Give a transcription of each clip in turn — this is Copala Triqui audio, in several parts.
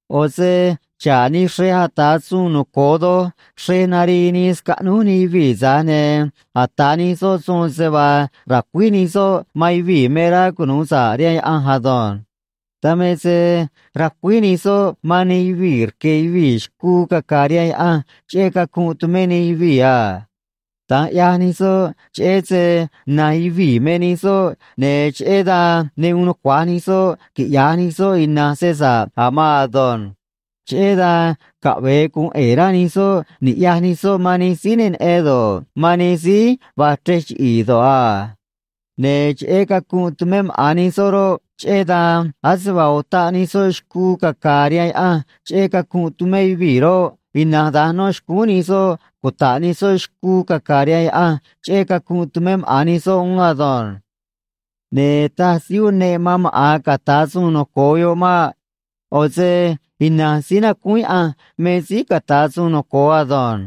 ꞌO̱ se xa̱ꞌ nij xrej ata̱ suun noco̱o doj xrej narii nii scaꞌnúj nij yuvii̱, tza̱j ne̱ ata̱ nij soꞌ suun se vaa ra̱cuíj nij soꞌ man yuvii̱ me rá cunu̱u sa̱ꞌ rihaan Yaꞌanj ado̱nj. Dan me se racuíj nij soꞌ man nij yuvii̱ rque̱ yuvii̱ xcuu caca̱a̱ rihaan Yaꞌanj cheꞌé cacunꞌ tumé nij yuvii̱ a. Da̱nj ꞌyaj nij soꞌ, cheꞌé se na̱nj yuvii̱ me nij soꞌ, ne̱ cheꞌé dan ne uun nucua̱j nij soꞌ quiꞌya̱j nij soꞌ ina̱nj se sa̱ꞌ a̱ maan ado̱nj. Cheꞌé dan caꞌve̱e gu̱un ꞌe̱e̱ rá nij soꞌ ni̱ꞌyaj nij soꞌ man nij síí ne neꞌen do̱ꞌ, man nij síí va̱j chrej chiꞌi̱i̱ do̱ꞌ a. Ne̱ cheꞌé cacunꞌ tumé maꞌa̱n nij soꞌ roꞌ, cheꞌé dan ase vaa utaꞌ nij soꞌ xcuu caca̱a̱ rihaan Yaꞌanj cheꞌé cacunꞌ tumé yuvii̱ roꞌ, ina̱nj da̱nj no̱ xcúún nij soꞌ cuta̱ꞌ nij soꞌ xcuu caca̱a̱ rihaan Yaꞌanj cheꞌé cacunꞌ tumé maꞌa̱n nij soꞌ uún ado̱nj. Ne̱ taj síí uneꞌ man maꞌa̱n ca̱ta̱ suun noco̱o yoꞌ maꞌ. ꞌO̱ se ina̱nj síí nacúún Yaꞌanj me síí ca̱ta̱ suun noco̱o ado̱nj.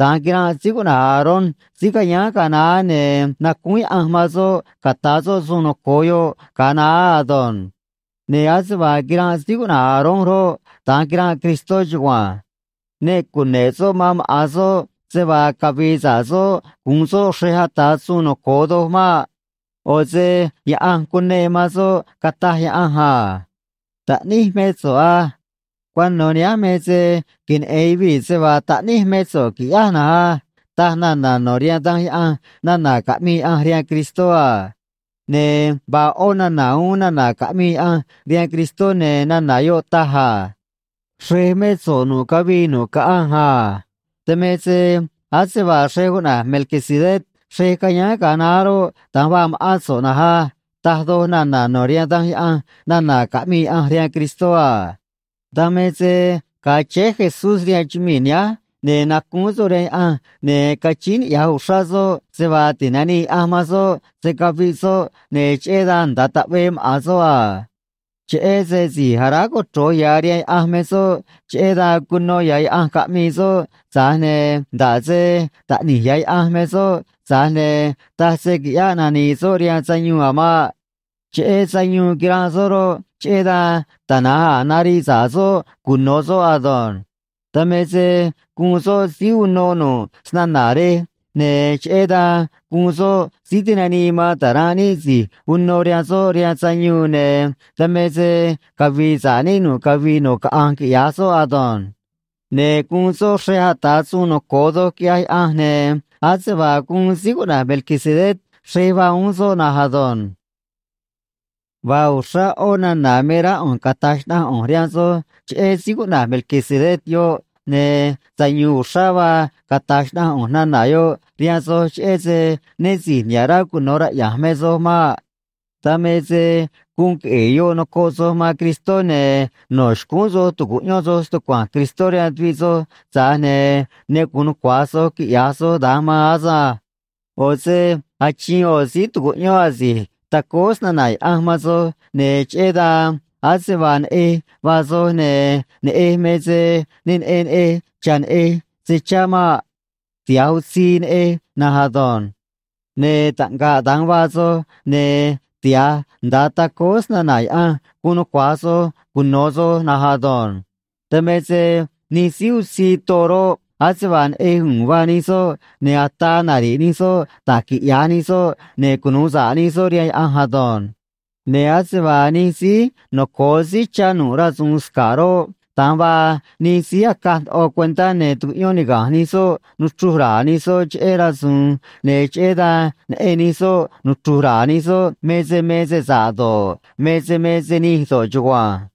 Da̱nj quiranꞌ síí cuꞌna̱j Aarón síí cayáán ga̱a naá, ne̱ nacúún Yaꞌanj man soꞌ ca̱ta̱ soꞌ suun noco̱o yoꞌ ga̱a naá ado̱nj. Ne̱ ase vaa quiranꞌ síí cuꞌna̱j Aarón roꞌ, da̱nj quiranꞌ Cristó chugua̱nj. Ne cune̱ꞌ soꞌ man maꞌa̱n soꞌ se vaa cavi̱i̱ sa̱ꞌ soꞌ gu̱un soꞌ xrej ata̱ suun noco̱o doj maꞌ. ꞌO̱ se Yaꞌanj cuneꞌ man soꞌ, cataj Yaꞌanj a: Taꞌníj mé so̱ꞌ á. Cuano̱ nihánj me se queneꞌe̱n yuvii̱ se vaa taꞌníj mé so̱ꞌ qui̱ꞌyáj na̱nj á, taj nana̱ no̱ rihaan Danj Yaꞌanj nana̱ caꞌmii Yaꞌanj rihaan Cristó a. Ne̱ vaa ꞌó nana̱ uún nana̱ caꞌmii Yaꞌanj rihaan Cristó, ne̱ nana̱ yoꞌ taj a: Xrej mé so̱ꞌ nu̱ꞌ cavii nu̱ꞌ caꞌanj a. Dan me se ase vaa xrej cuꞌna̱j Melquisedec xrej cayáán ga̱a naá roꞌ, da̱nj vaa ma̱ꞌán so̱ꞌ na̱nj á, taj doj nana̱ no̱ rihaan Danj Yaꞌanj nana̱ caꞌmii Yaꞌanj rihaan Cristó a. Dan me se ga̱a chéé Jesús rihaan chumii̱ nihánj, ne̱ nacúún soꞌ rihaan Yaꞌanj ne̱ cachíín niꞌya̱j uxrá soꞌ se vaa ti̱nanii Yaꞌanj man soꞌ se̱ caviꞌ soꞌ, ne̱ cheꞌé dan nda̱a taꞌvee maꞌa̱n soꞌ a. Cheꞌé se si̱j aráj cochro̱j ya̱ rihaan Yaꞌanj me soꞌ, cheꞌé dan cuno ya̱ Yaꞌanj caꞌmii soꞌ, tza̱j ne̱ nda̱ꞌ se Taꞌni̱j ya̱ Yaꞌanj me soꞌ, tza̱j ne̱ taj se quiꞌyáꞌ nani̱i̱ soꞌ rihaan sayuun a̱ maꞌ. Cheꞌé sayuun quiranꞌ soꞌ roꞌ, cheꞌé dan tana̱nj a̱ nariꞌ sa̱ꞌ soꞌ cuno̱ soꞌ ado̱nj. Dan me se guun soꞌ síí uno nu̱ꞌ snana̱ rej, ne̱ cheꞌé dan guun soꞌ síí tinanii man ta̱ranꞌ níꞌ si̱j uno rihaan soꞌ rihaan sayuun, ne̱ dan me se cavi̱i̱ sa̱ꞌ níꞌ nu̱ꞌ cavii nu̱ꞌ caꞌanj, quiꞌya̱j soꞌ ado̱nj. Ne̱ guun soꞌ xrej ata̱ suun noco̱o doj, quiꞌyaj Yaꞌanj, ne̱ ase vaa guun síí cuꞌna̱j Melquisedec xrej vaa uún soꞌ na̱nj ado̱nj. Vaa uxrá ꞌó nana̱ me rá ꞌu̱nj cata̱j xnaꞌanj ꞌu̱nj rihaan soj cheꞌé síí cuꞌna̱j Melquisedec yoꞌ, ne̱ sayu̱u̱n uxrá vaa cata̱j xnaꞌanj ꞌu̱nj nana̱ yoꞌ rihaan soj, cheꞌé se né si̱j niha̱ꞌ rá cuno̱ raꞌya̱nj me soj maꞌ. Dan me se guun queꞌe̱e̱ yoꞌ nocoꞌ soj man Cristó, ne̱ no̱ xcúún soj tu̱cuꞌyón soj stucua̱nj Cristó rihaan tuviꞌ soj, tza̱j ne̱ ne gu̱un nucua̱j soj quiꞌya̱j soj da̱nj maan asânj. ꞌO̱ se achiin ꞌo̱ síí tu̱cuꞌyón asi̱j tacóó snana̱ Yaꞌanj man soj, ne̱ cheꞌé dan ase vaa neꞌej vaa soj, ne̱ neꞌej me se ne neꞌen neꞌej cha̱ neꞌej se chá maꞌ. Tiha̱j utzii neꞌej na̱nj ado̱nj. Ne̱ taꞌngaꞌ da̱nj vaa soj, ne̱ tiha̱j nda̱a tacóó snana̱ Yaꞌanj gu̱un nucua̱j soj cuno̱ soj na̱nj ado̱nj. Dan me se nij síí utzii too roꞌ, ase vaa neꞌej u̱u̱n vaa nij soꞌ, ne̱ ataa nari̱ꞌ nij soꞌ da̱j quiꞌya̱j nij soꞌ ne̱ cunu̱u sa̱ꞌ nij soꞌ rihaan Yaꞌanj ado̱nj. Ne̱ ase vaa nij síí noco̱o síí chá nu̱ꞌ rasu̱u̱n sca̱ꞌ roꞌ, da̱nj vaa nij síí acaj ndoꞌo cuentá, ne̱ tucuꞌyón niga̱nj nij soꞌ nuchru̱j ra̱a̱ nij soꞌ cheꞌé rasu̱u̱n, ne̱ cheꞌé dan neꞌen nij soꞌ nuchru̱j ra̱a̱ nij soꞌ me se me se sa̱ꞌ do̱ꞌ, me se me se nij do̱ꞌ chugua̱nj.